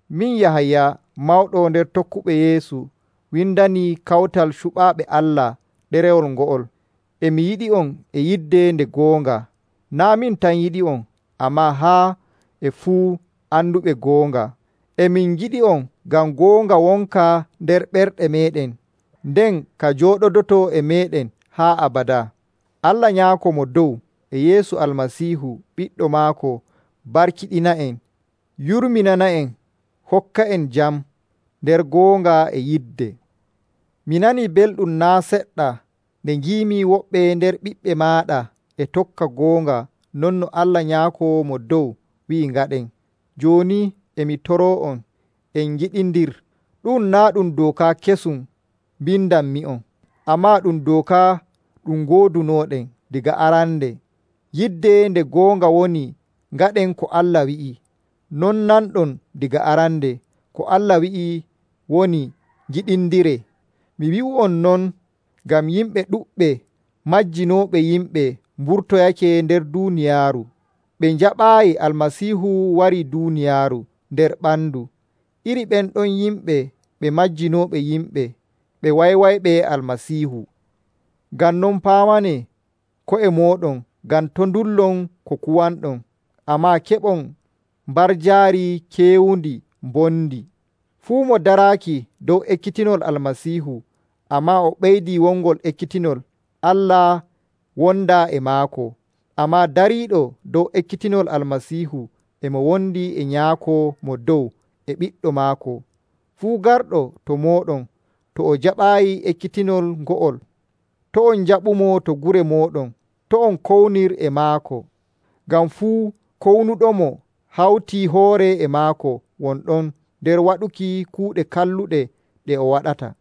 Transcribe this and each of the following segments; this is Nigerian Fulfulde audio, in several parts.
Min, Yahaya, mawɗo nder tokkuɓe Yeesu windani kawtal cuɓaaɓe Allah ɗerewol ngo'ol. E mi yiɗi'on e yidde nde goonga. Naa' min tan yiɗi'on ammaa haa e fuu anduɓe goonga. E min ngiɗi'on ngam goonga wonka nder ɓerɗe meeɗen, nden ka jooɗodoto e meeɗen haa abadaa. Allah Nyaako Mo Dow e Yeesu Almasiihu ɓiɗɗo maako barkiɗina'en, yurminana'en, hokka'en jam nder goonga e yidde. Mi nanii belɗum naa' seɗɗa nde ngiimi woɓɓe nder ɓiɓɓe maaɗa e tokka goonga non no Allah Nyaako Mo Dow wi'i ngaɗen. Jooni e mi toroo'on, en ngiɗindir. Ɗu'um naa' ɗum dooka kesum mbindanmi'on, ammaa ɗum dooka ɗum ngoodunooɗen daga arande. Yidde nde goonga woni ngaɗen ko Allah wi'i. No nanɗon daga arande, ko Allah wi'i woni ngiɗindiree. Mi wi'u non ngam yimɓe ɗuɗɓe majjinooɓe yimɓe mburtoyake nder duuniyaaru. Ɓe njaɓaayi Almasiihu warii duuniyaaru nder ɓandu. Iri ɓen ɗon yimɓe ɓe majjinooɓe yimɓe, ɓe wanywanyɓe Almasiihu. Ngam non paamanee ko'e mooɗon ngam to' ndullon ko kuwanɗon, ammaa keɓon mbarjaari kewndi mbondi. Fuu mo daraaki dow ekkitinol Almasiihu, ammaa o ɓeydi wongol ekkitinol, Allah wondaa e maako. Ammaa dariiɗo dow ekkitinol Almasiihu e mo wondi e Nyaako Mo Dow e Ɓiɗɗo maako. Fuu garɗo to mooɗon, to o jaɓaayi ekkitinol ngo'ol, to' on njaɓumo to gure mooɗon, to' on kownir e maako. Ngam fuu kownuɗomo hawtii hoore e maako won ɗon nder waɗuki kuuɗe kalluɗe ɗe o waɗata.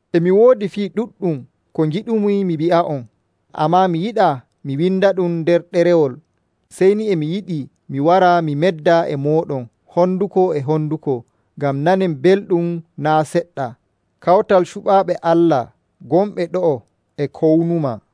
E mi woodi fii ɗuɗɗum ko ngiɗumi mi wi'a'on, ammaa mi yiɗaa mi windaɗum nder ɗerewol. Sey ni e mi yiɗi mi wara mi medda e mooɗon honduko e honduko, ngam nanen belɗum naa' seɗɗa. Kawtal cuɓaaɓe Allah gonɓe ɗo'o e kownumaa.